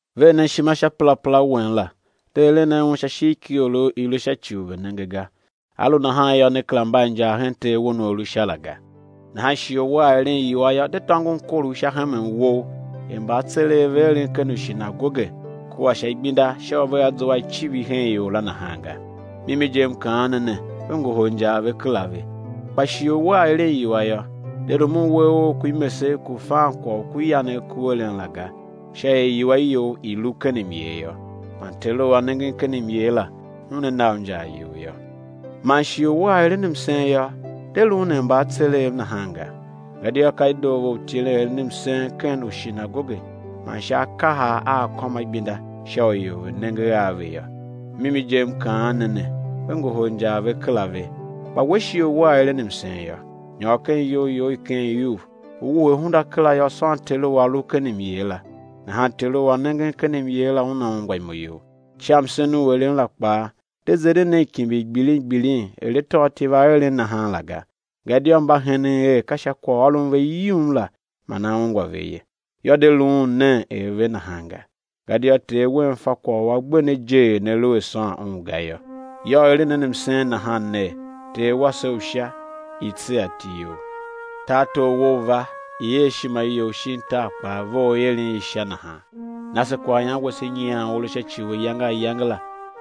Ver nen ishima sha perapera wen la, de eren nen un sha ishigh ki iorough i̱ lu sha ci u ve̱ nenge ga; á lu nahan yô, ne kera mba a injar hen Ter wen u A lu Sha la ga. Nahan shighe u wea eren iwua yô, de tôngon korough sha hemen wou, er mbaatsereghev ve eren ken ushinagoge kua sha igbenda sha u vea zua a icivir hen ior la nahan ga. Mimi je, M kaan ne ne, ve ngohol injar ve kera ve. Kpa shighe u wea eren iwua yô, de rumun uwegh ough ku imesegh ku̱ fan kwagh u ku yanegh ku eren la ga; sha er iwua you i̱ lu ken myer yô, man Teru u A nengen ken myer la, Una na u injar you yô. Man shighe u wea eren msen yô, de luun er mbaatsereghev nahan ga; gadia ka i doo ve u tilen eren msen ken ushinagoge man sha akahar a akômaigbinda sha u ior ve̱ nenge a ve yô. Mimi je M kaan ne ne, ve ngohol injar ve kera ve. Kpa we, shighe u wea eren msen yô, nyôr ken iyou you i ken iuv, u wuhe hunda kera yô, sôn Teru u A lu ken myer la; Una ungwa imo you. Sha msen u eren la kpaa, de zeren nen kimbir gbilin gbilin er atôatyev a eren nahan la ga, gadia mba henen er ka sha kwaghôron ve yum la man á ungwa ve ye. Yô, de luun nen er ve nahan ga; gadia Ter wen fa kwagh u a gbe ne je er ne lu a sôn Un ga yô. Yô, eren nen msen nahan, ner: Ter wase u Sha, i̱ tsegha iti You, tartor Wou u̱ va, i̱ er ishima You shin tar kpaa vough er i eren i Sha nahan; na se kwaghyan wase nyian u a lu sha ci u ayange ayange la;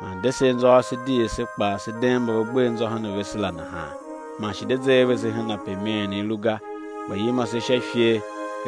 man de se anzô ase di er se kpaa se deen mba ve gbe anzô hen vese la nahan; man shi de ze a vese hen ape imeen i lu ga, kpa yima se sha ifer.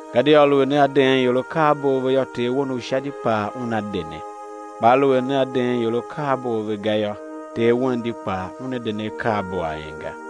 Gadia aluer nea deen ior akaabo a ve yô, Ter wen u Sha di kpaa Una de ne. Kpa aluer nea deen ior akaabo a ve ga yô, Ter wen di kpaa Una de ne akaabo a en ga.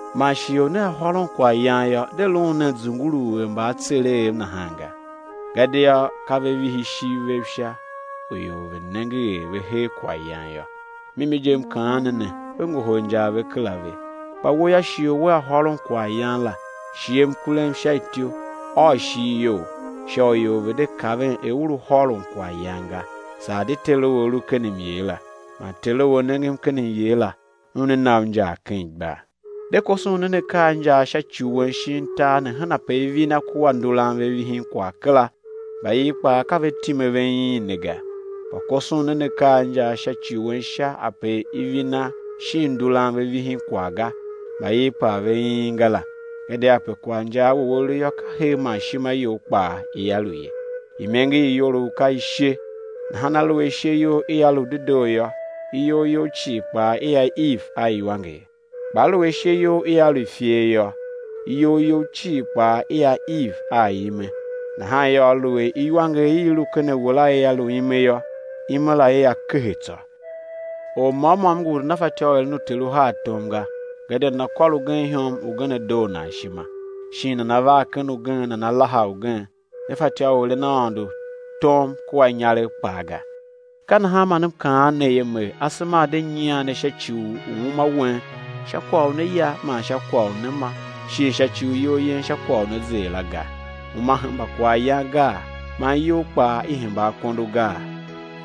Man shighe u nea hôron kwaghyan yô, de luun nen zunguluu er mbaatsereghev nahan ga; gadia ka ve vihi ishiv vev sha u ior ve̱ nenge er ve her kwaghyan yô. Mimi je, M kaan ne ne, ve ngohol injar ve kera ve. Kpa we yô, shighe u wea hôron kwaghyan la, shighe mkurem sha ityou, ôô ishigh you, sha u ior ve̱ de kaven er u lu hôron kwaghyan ga, saa di Teru u A lu ken myer la; man Teru u A nengen ken myer la, Una na u injar ken igbar. De koson nen akaa a injaa sha ci wen shin tar ne hen ape ivina kua nduran ve vihin kwagh kera, mbaiv kpaa ka ve time ve iin ne ga; kpa koson nen akaa a injaa sha ci wen Sha, ape ivina shin nduran ve vihin kwagh ga, mbaiv kpaa ve iin ga la. Gadia ape kwaghinjaa wou a lu yô, ka her man ishima you kpaa ia lu ye. Imenger i iyolough ka ishe; nahan aluer ishe you ia lu dedoo yô, iyol you cii kpaa ia iv a iwanger. Kpa aluer ishe you ia lu i ifer yô, iyol you cii kpaa ia iv a ime. Nahan yô, aluer iwanger i i lu ken a we la ia lu ime yô, ime la, ia kehe tsô! Or môm môm ngu u nana fatyô u eren uter uhar tom ga; gadia nana kôr ugen ihom, ugen á doo nan ishima, shin nana var ken ugen, nana laha ugen. Ne fatyô u eren Aôndo tom kua inyaregh kpaa ga. Ka nahan man M kaan ne ye Mer, asema, a̱ de nyian ne sha ci u uma, wen, sha kwagh u né ya man sha kwagh u né ma, shin sha ci u iyol yen, sha kwagh u né zer la, ga. Uma hemba kwaghyan gaa, man iyol kpaa i hemba akondo gaa?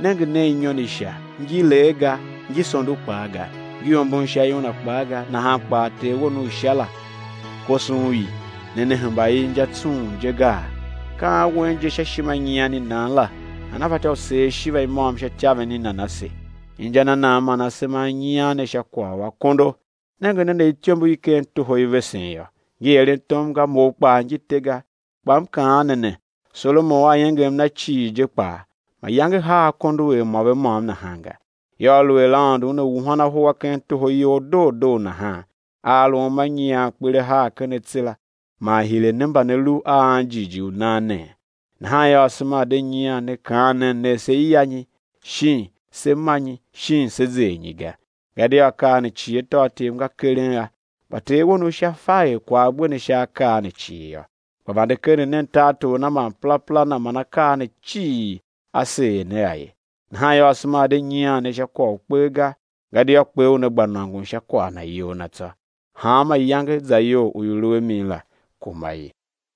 Nenge nen inyon i sha, ngi lee ga, ngi sondo kpaa ga, ngi ombon sha iuna kpaa ga; nahan kpaa Ter wen u Sha la koson i. Ne ne hemba i inja tsung je gaa? Ka an wen je sha ishima i nyian i nan la, nana fatyô u seer ishiva i môm sha ityaven i nan ase? Inja na nan man asema a nyian ne sha kwagh u akondo? Nenge nen er ityombo i ken toho i vesen yô; ngi eren tom ga, mou kpaa ngi te ga. Kpa M kaan ne ne, Solomon a iengem na cii je kpaa, mayange haa akondo er mô ve môm nahan ga. Yô, aluer Aôndo Una wuhan ahu a ken toho iyol doo doo nahan, a a lu uma nyian, kper a haa ken atse la, man hire ne mba ne lu a anjighjigh u nan nee? Nahan yô, asema a̱ de nyian ne, kaan ner ner: Sé ya nyi? Shin: Sé ma nyi? Shin Sé zer nyi? ga. Gadia akaa ne cii atôatyev nga keren a, kpa Ter wen u Sha fa er kwagh a gbe ne sha akaa ne cii yô. Kpa vande keren nen tartor Na man perapera Na, man akaa ne cii á seer ne a ye. Nahan yô, asema a̱ de nyian ne sha kwagh u kper ga, gadia kper una gba nôngon sha kwagh na iyol na tsô; hanma iyange zayol u i lu a mi la, kuma i.